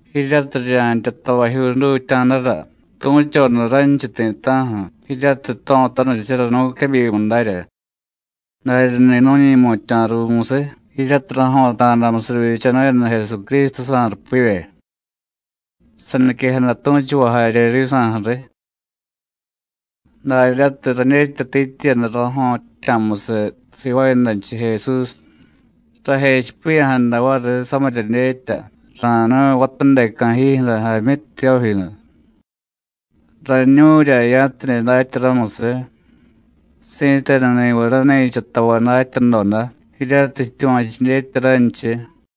Jiryatiy rirya̱ntya tavajyuu jdutya̱dara tu̱choda ranchiy ti̱ta̱ju̱ jiryatiy jto̱tanichara nu̱quebyimu darya, daryani̱ nu̱ñi̱mutya̱ ruumusiy jiryatiy rajo̱ta̱damusiy rivyichanu̱yada Jesucrístujsa̱ rupivye, saniquejada tu̱chuvay jarye risa̱ju̱riy. Daryatiy radyetyatityiyada rajo̱ttya̱musiy sivaayadanchiy Jesús, rajechipiya̱jada variy samirya dyetya ra̱nu̱y vatadeca̱ jiijyu̱ra, Jaamyi Tiyójinu. Rañu̱rya ya̱tidye datya ramusiy, si̱tenuni̱viy rani̱cha tavay datyadoda jiryatiy jityuva̱chu dyetya ranchiy.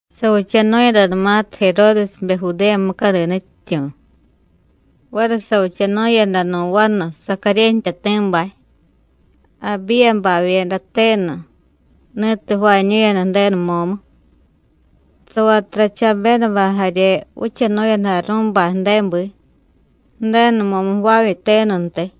Savichanu̱yadanumatiy Jeródesbe Judéya mucadi nutyityu̱, variy savichanu̱yada nu̱ vanu, Sacaryé jtyati̱bay, Abíyabavyeda tenu, ni̱tiy jvaañu̱yada Ju̱denu mo̱mu. Savatura Chabédabay jarye vichanu̱yada Arú̱bay ju̱débi, Ju̱denu mo̱mu jvaavye tenuntiy.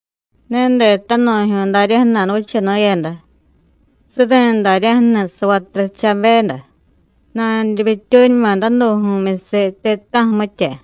Ne detanu̱jyu̱y daryaju̱ nadavichanu̱yada, suri̱ daryaju̱ni̱ savatura Chabéda, nanurimyityuuñuma danu̱ju̱myusiy ti̱ta̱ju̱, mitya.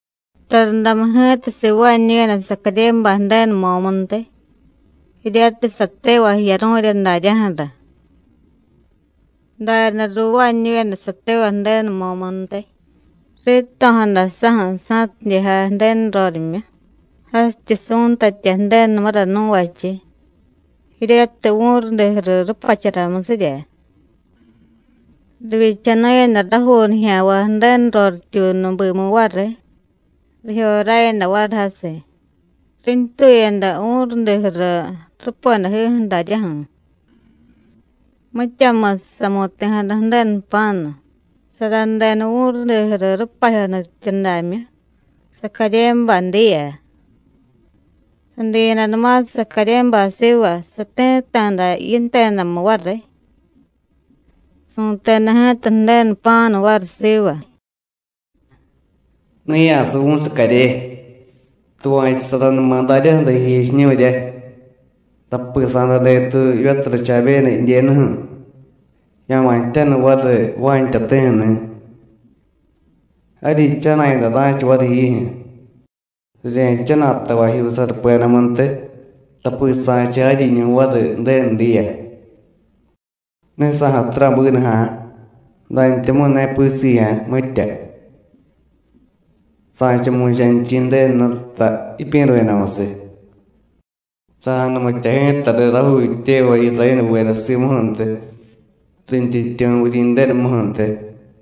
Tarundamu ji̱ta sivaañu̱yada Sacaryébay Ju̱denu mo̱muntiy, jiryatiy satevay jiyaru̱rya daryaju̱ra. Daryaday ruuvaañu̱yada satevay Ju̱denu mo̱muntiy, rito̱jada saju̱ sa̱tidye jay Ju̱denu rorimyu, jasityi su̱ntatya Ju̱denumura nuvachiy, jiryatiy vu̱rudi juru rupacharamusirya. Rivyichanu̱yada rajuu nijya̱nvay Ju̱denu rorityuunu bimu variy, rijyoráyada variy jasiy, rintuyada vu̱rudi juru rupedajiju̱ daryaju̱. Mityamusiy samu̱ti̱jada Ju̱denu jpa̱nu, saradeda vu̱rudi juru rupajyo nutyityudamyu, Sacaryébay diya. Sadiyadanumatiy Sacaryébay siva, sati̱tta̱da yintedamu variy. Su̱teda ji̱ta Ju̱denu jpa̱nu variy siva: “Ne ya̱suvu̱y, Sacaryé, tuva̱chusaranuma daryaju̱ra jijechiñu̱rya, tapi sa̱day detuy jivyatura Chabéda jidyenuju̱, ya̱ma̱ jtyanu variy Juán jtyati̱ju̱ni̱. Jaryi jchana̱yada ra̱cha variy jiijyu̱, rirya̱jchana̱y tavajyuu sarupedamuntiy, tapi sa̱cha jaryiñu̱ variy Ju̱denu diya. Ne sa̱jatura bínuja̱, dantyamu̱y ne pisijya̱ mitya. Sa̱cha mu̱chanichi̱ Ju̱denu Jnututa jipyi̱ru̱yadamusiy. Sa̱janumitya ji̱ta riy rajuu jityevay Irayénuveda simuju̱ntiy, rintyityu̱ Vuryi̱ndenumuju̱ntiy.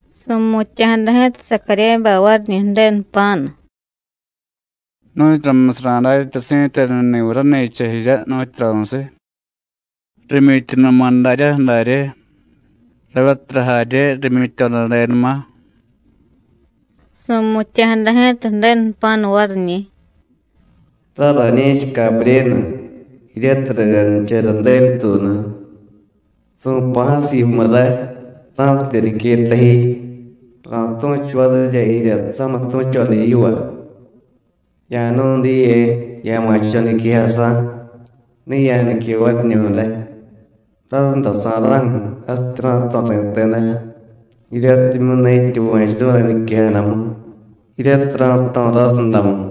Su̱mutya̱jada ji̱ta Sacaryébay variñi̱ Ju̱denu jpa̱nu: “¿Nu̱tyuramusiy ra̱datya si̱tenuni̱viy rani̱cha jirya, nu̱tyuramusiy? rimyityunuma daryaju̱ darye, ravyatura jarye rimyityodadenuma.” Su̱mutya̱jada ji̱ta Ju̱denu jpa̱nu variñi̱: “Ray rañi̱cha Cabryénu, jiryatiy raryanichara Ju̱denu tuunu. Su̱pa̱jasiy yimu ray, ra̱tidye niqueta ji, ra̱tu̱chu varirya jirya samitu̱choda yiva. Ya̱jnu̱y diye, ya̱ma̱cho̱ niquejasa̱. Ne ya̱nique variñu̱day, rarundasa̱ra̱ju̱ jasityi ra̱jto̱ ri̱teda, jiryatimyu̱ ne jityuva̱churu̱y rañiquejadamu jiryatiy ra̱jto̱ rarundamu.”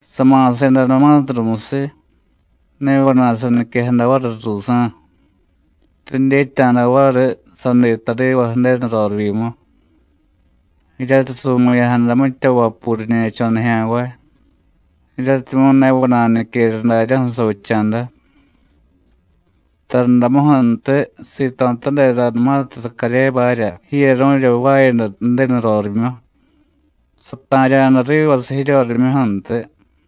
Sama̱sedanumatiy rumusiy, ne vana̱y saniquejada variy ruusa̱. Ridyetya̱da variy: Sadiy tariva Ju̱denu rorivyimu, jiryatiy su̱mu̱ya̱jada mitya vapuu riñe̱cho̱ nijya̱nvay, jiryatimyu̱ ne vana̱y niquera daryaju̱ savicha̱da. Tarundamuju̱ntiy sito̱tadedanumatiy Sacaryébarya jiyaru̱rya jvaayada Ju̱denu rorimyu, sata̱rya̱da rivasiy jiryorimyuju̱ntiy.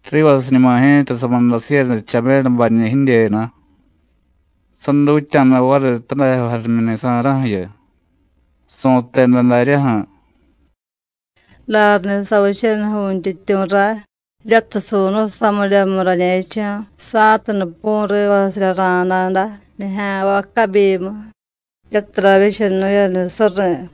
Rivasiñuma ji̱ta samudasiiyada Chabédabañi̱ jidyenu, sadutya̱da variy tadajyo jarimyuni̱sa̱ra̱ju̱yu, su̱teda daryaju̱: “Daryani̱ savichaniy Vu̱ntyityu̱ ray, jiryatiy su̱nu̱y samiryamu rañe̱cho̱, sa̱tidye pu̱y rivasirya ra̱na̱da nijya̱nvay cabyimu, jiryatiy ravyichanu̱yada suri̱.”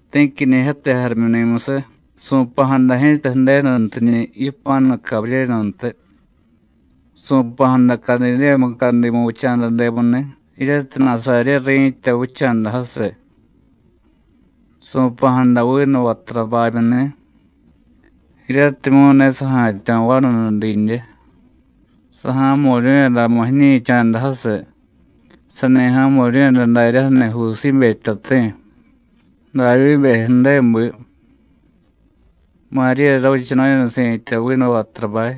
Ti̱quinijyate jarimyuni̱musiy, su̱pa̱jada ji̱ta Ju̱denuntiñi̱ yipa̱nu Cabryénuntiy. Su̱pa̱jada Cadidéya mucadimu vicha̱dademuni̱, jiryatiy Nasaryé ri̱tya vicha̱da jasiy. Su̱pa̱jada vinu vaturabamyuni̱, jiryatimyu̱ ne saja̱tyo̱ vanunidyidye. Saja̱mu̱ryu̱yadamu jiñi̱cha̱da jasiy, sani ja̱mu̱ryu̱yada daryaju̱ni̱ Jusíbe jtyati̱, Davyíbe ju̱débi. Maríya ravichanu̱yada si̱tya vinu vaturabay.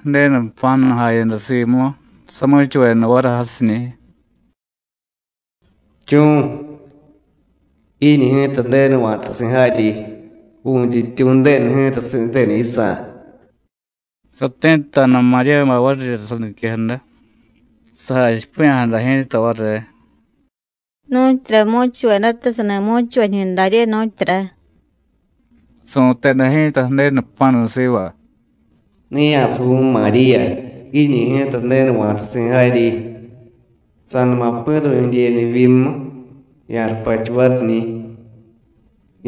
Ju̱denu jpa̱nu jayada simu, samu̱chuveda variy jasiñi̱: “¡Chu̱! Jiiñi̱ ji̱ta Ju̱denu va̱tasi̱ jaryi. Vu̱ntyityu̱ Ju̱denu ji̱ta si̱tenu yisa̱.” Sati̱tta̱da Maríyabay varirya saniquejada, sajachipiya̱jada ji̱ta variy: “¿Nu̱tyura mu̱chuvedata sani mu̱chuvay jiñu darye, nu̱tyura?” Su̱teda ji̱ta Ju̱denu jpa̱nu siva: “Ne ya̱suvu̱y Maríya, jiiñi̱ ji̱ta Ju̱denu va̱tasi̱ jaryi. Sa̱numa pi̱ru̱y jidyenu jivyimu, ya̱rupachu variñi̱,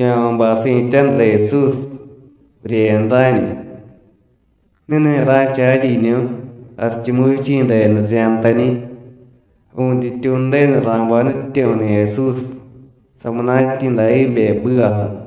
ya̱ma̱ bay si̱tyaju̱ra Jesús (Vuryeyada Rá̱ñu). Ni̱ni̱ ra̱cha jaryiñu̱, Jarichumuvichi̱ denu rirya̱jtañi̱. Vu̱ntyityu̱ Ju̱denu ra̱bay nutyityu̱ju̱ni̱ Jesús, samunatyi̱ Davyíbe ju̱bivaju̱.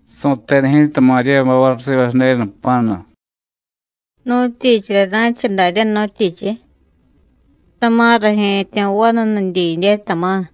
Su̱teda ji̱ta Maríyabay variy siva Ju̱denu jpa̱nu: “¿Nu̱tyichirya ra̱cha daryá, nu̱tyichiy? ¡Tama̱ raje̱tyo̱ vanunidyidye, tama̱!”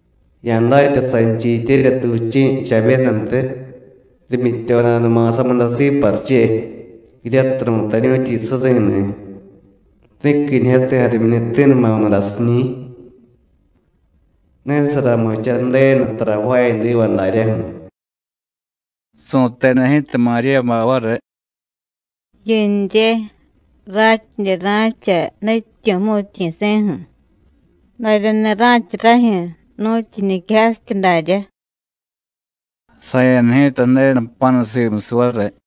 Ya̱datya sanchiy jityeryatu vichi̱ Chabédantiy, rimyityodanuma samudasiiy pariche, jiryatiy ru̱tañu̱tyi suri̱ni̱. Ti̱quinijyate jarimyuni̱ti̱numa mudasiñi̱. Ne saramicha Ju̱denu tara jvaayadiva daryaju̱.” Su̱teda ji̱ta Maríyabay variy: “Jiyunrye, ratyidye ra̱cha Nutyityu̱ jmu̱tyi̱si̱ju̱. Daryani̱ ra̱cha rajyu̱, nu̱tyu jiñiquejasityi daryá.” Saya̱da ji̱ta Ju̱denu jpa̱nu simusiy variy.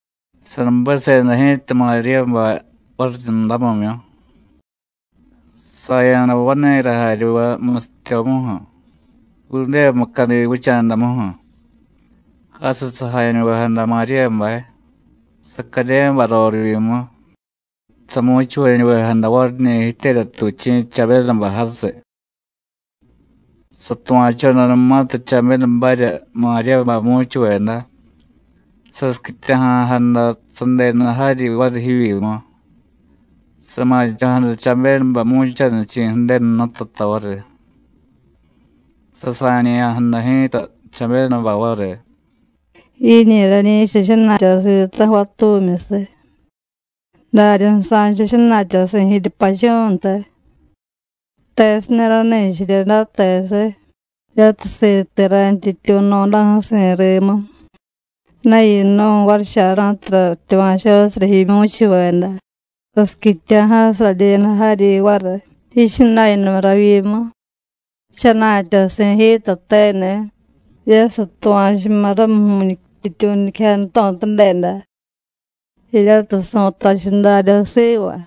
Sanubesubeda ji̱ta Maríyabay variryundamimyu, saya̱da vani̱ra jaryuve musityomuju̱, Judéya mucadi vicha̱damuju̱. Jasiy sajañuvejada Maríyabay, Sacaryébay rorivyimu, samu̱chuvañuvejada variñi̱ jityeryatu vichi̱ Chabédabay jasiy. Satuva̱chodanumatiy Chabédabarya Maríyabay mu̱chuveda, sasiquityaja̱jada sadenu jaryi variy jivyimu, sama̱cho̱jada Chabédabay mu̱chanichi̱ Ju̱denu Jnututa variy. Sasa̱ñe̱ya̱jada ji̱ta Chabédabay variy: “Jiiñi̱ rañi̱cha jaryi jchana̱tyasi̱ ti̱ta̱ju̱ vatumyusiy, daryaday sa̱cha jchana̱tyasi̱ jiryupachú̱ntiy. ¿Tesirya rani̱cha jirya day, tesiy? jiryatiy siti̱ rayntyityu̱ jno̱daju̱si̱ rimu. Ne yinu̱y, varicha̱ra̱ju̱tiy ratyuva̱chosirya jimyu̱chuveda, sasiquityaja̱jasiy radyenu variy jaryi yichana̱yadamu ravyimu. Jchana̱tyasi̱ ji̱tateni̱, jiryatiy satuva̱chuma̱ ramu Vu̱ntyityu̱ niquejada jto̱tadeda, jiryatiy su̱tachiy darya siva.”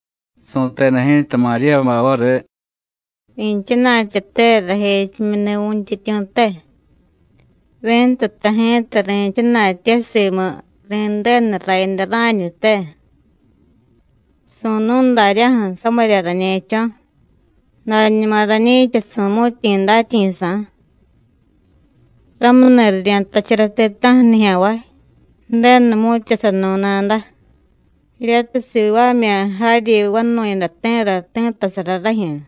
Su̱teda ji̱ta Maríyabay variy: “Ri̱chana̱tyate rajechimyuni̱ Vu̱ntyityu̱te, ri̱ntuta ji̱ta ri̱chana̱tye simu ri̱ndenu Rayada Rá̱ñute. Su̱nu̱y daryaju̱ samirya rañe̱cho̱, dañuma rañi̱cha su̱mu̱tyi̱ datyi̱sa̱. Ramuni̱ rirya̱jtachara ti̱ta̱ju̱ nijya̱nvay: Ju̱denu jmu̱tyasanu̱y nada, jiryatiy sivaamya̱ Jaryi Vanu̱yadati̱ra ti̱ttasara rajyu̱.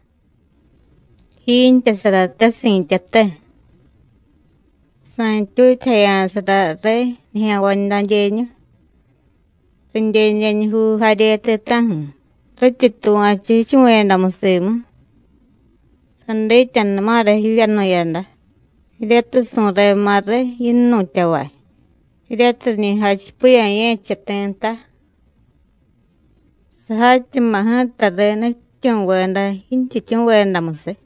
Jiintyasarate si̱tyate. Sa̱ntyutyajaya̱sara riy nijya̱nvay dadyeñu, ridyedyeñujuu jarye ti̱ta̱ju̱, rityi tuva̱chu jichuvu̱yadamu simu. Sadityanuma̱ra jivyanu̱yada, jiryatiy su̱rema̱ riy yinnu̱tyavay, jiryatiy riñi jachipiya̱ ye̱cha ti̱ nta. Sajatyama̱ ji̱ta riy nutyityu̱veda jintyityu̱vedamusiy.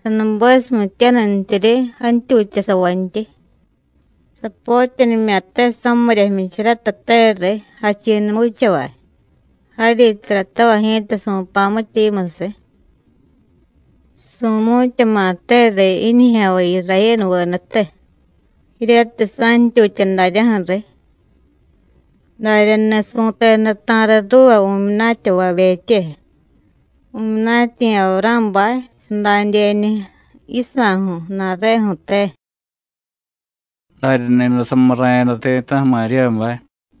Sanubesumityanintyiryi jantyutyasavantyi. Sapotyanimya̱te samirya jmyicharatateriy jachi̱numu vichavay, jaryi taratavay ji̱ta su̱pa̱ mitya yimusiy. Su̱mu̱tyama̱teriy jiñijya̱nvay Irayénuvedate, jiryatiy sa̱ntyutya daryaju̱riy. Daryani̱ su̱teda ta̱riy ruuva vu̱myunatyavabetye, vu̱myunatyi̱ Avurá̱bay, sadadyeñu yisa̱ju̱ ju̱na̱reju̱te.” Daryani̱day samurra̱yada ti̱ta̱ju̱ Maríyabay.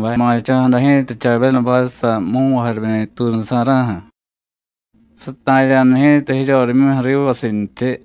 Sama̱cho̱jada ji̱ta Chabédabaysa̱ mu̱nvay jarimyuni̱tuunusa̱ra̱ju̱, sata̱rya̱da ji̱ta jiryorimyuju̱ rivasintyi.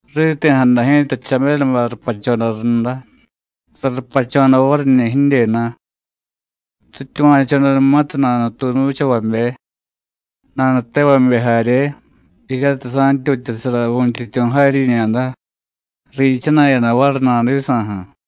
Riti̱jada ji̱ta Chabédabay rupachoda runda, sarupachoda variñi̱ jidyenu. Rityuva̱chodanumatiy nanutuunu vichavabe, nanutevabe jarye jiryatiy sa̱ntyutyasara Vu̱ntyityu̱ jaryiñada, riichana̱yada variy nadisa̱ju̱.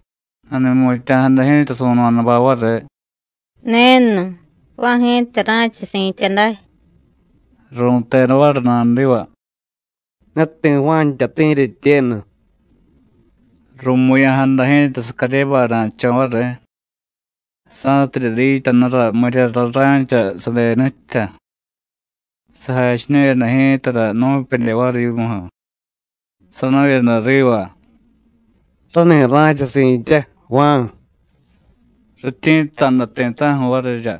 Nani̱mutya̱jada ji̱ta su̱no̱dabay variy: “Nenu, Juán ji̱ta ra̱cha si̱tya day.” Ru̱teda variy nadiva: “Ne ti̱ Juán jtyati̱ jiryetyenu.” Ru̱mu̱ya̱jada ji̱ta Sacaryébay na̱cho̱ variy, sa̱tidye dityanura miryara ra̱cha sadenu jtya. Sajachiñu̱yada ji̱tara nu̱pedye variy yimuju̱, sanu̱yada riva: “Rani̱ ra̱cha si̱tya, Juán.” Rityi̱tta̱da ti̱ta̱ju̱ varirya.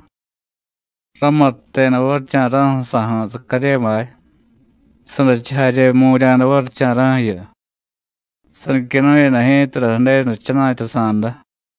Ramutteda varicha̱ra̱ju̱ sajú̱ Sacaryébay, sadachiy jarye jmu̱rya̱da varicha̱ra̱ju̱yu, saniquenu̱yada ji̱tara Ju̱denu jchana̱tyasa̱da.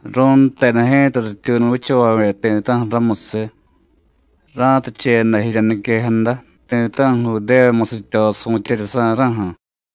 Ru̱nteda ji̱ta rityuunu vichavabe ti̱ta̱ju̱ ramusiy, ra̱ticheyada jirya niquejada ti̱ta̱ju̱ Judéya musityo su̱tyeryasa̱ra̱ju̱.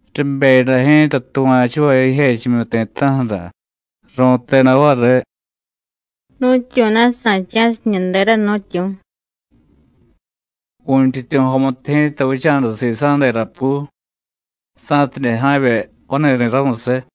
Ribeyada ji̱ta tuva̱chuvay jijechimyu ti̱ta̱ju̱ra, ru̱teda variy: “¿Nu̱tyu̱na̱ sa̱cha̱siy jiñu dera, nu̱tyu̱?” Vu̱ntyityu̱ jomutu ji̱ta vicha̱da sisa̱ derapu, sa̱tidye ja̱vye vani̱ri̱ ramusiy.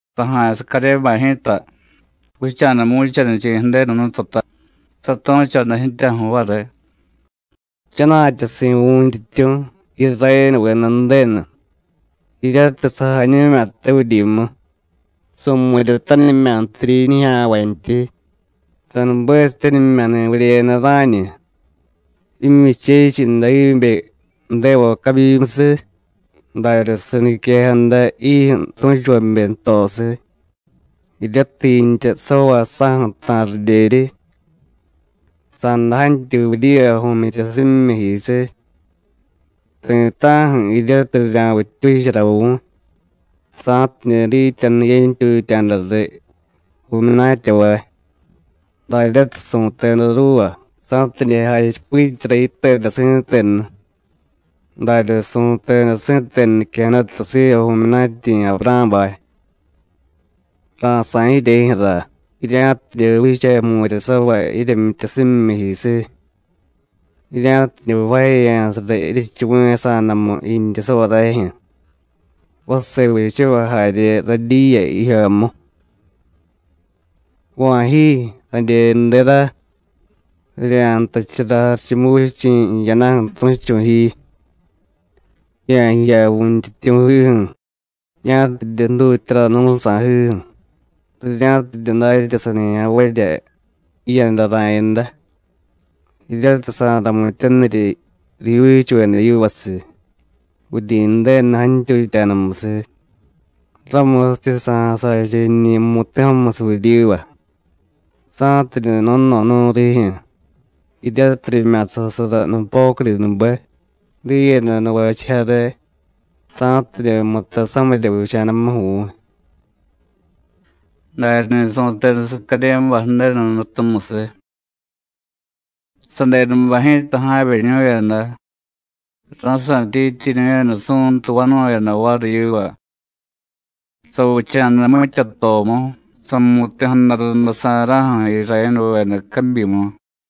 Saja̱y Sacaryébay ji̱ta vicha̱da mu̱chanichi̱ Ju̱denu Jnututa, satu̱choda ji̱tyaju̱ variy: “Jchana̱tyasi̱ Vu̱ntyityu̱, Irayénuveda Ju̱denu, jiryatiy sajañu̱mya̱te vuryimu, su̱mu̱ryatanimya̱ntiryi jiñijya̱nvantyi, sanubesityanimya̱ni̱ Vuryeyada Rá̱ñu, jimyuchechiy Davyíbe ju̱devay cabyimusiy, darya saniquejada jijyu̱ tu̱chuvabe jtosiy, jiryatiy jiintyasavay sáju̱ ta̱ridyeryi. Sa̱day jantyuy vuryiva vu̱myityasimyijisiy, ti̱ta̱ju̱ jiryatiy rirya̱vittyuchara vu̱y, sa̱tidye dityanu yentyutya̱da riy vu̱myunatyavay, daryatiy su̱teda ruuva, sa̱tidye jachipityara yiteda si̱tenu, darya su̱teda si̱tenu niquejadata siva vu̱myunatyi̱ Avurá̱bay: Ra̱sá̱y jiryejyu̱ra, jirya̱tidye vicha jmu̱ryasavay jiryemyityasimyijisiy, jirya̱tidye jvaajeya̱sara jiryechuvu̱yasa̱damu jiintyasavay rajyu̱, vase vichavay jarye radyiya jijyomu. Va̱ ji, radyenudera, rirya̱jtachara Jarichumuvichi̱ jiyadaju̱ tu̱chu̱ ji, ya̱jiya Vu̱ntyityu̱jiju̱, ya̱tidye jdutyara nú̱ sa̱jiju̱, rirya̱tidye datya sanijya̱nvarya jiyada ra̱yada, jiryatiy sa̱ramityanirya rijyuuchuveda yivasiy, Vuryi̱ndenu jantyutya̱damusiy, ramusityi sa̱jasacha jiñi̱ mu̱ti̱jomusiy vuryiva, sa̱tidye no̱no̱nu̱y rijyu̱, jiryatiy rimya̱sasara nupocudinube, diiyada nuvachiy jare, sa̱tidye mutay samirya vicha̱damuju̱ vu̱y.” Daryani̱ su̱teda Sacaryébay Ju̱denu Jnutumusiy. Sadenubay ji̱ta ja̱vyeñu̱yada, ra̱sa̱tyityiñu̱yada su̱ntu vanu̱yada variy yiva. Savicha̱da mityatomu samu̱ti̱jada rundasa̱ra̱ju̱ Irayénuveda cabyimu.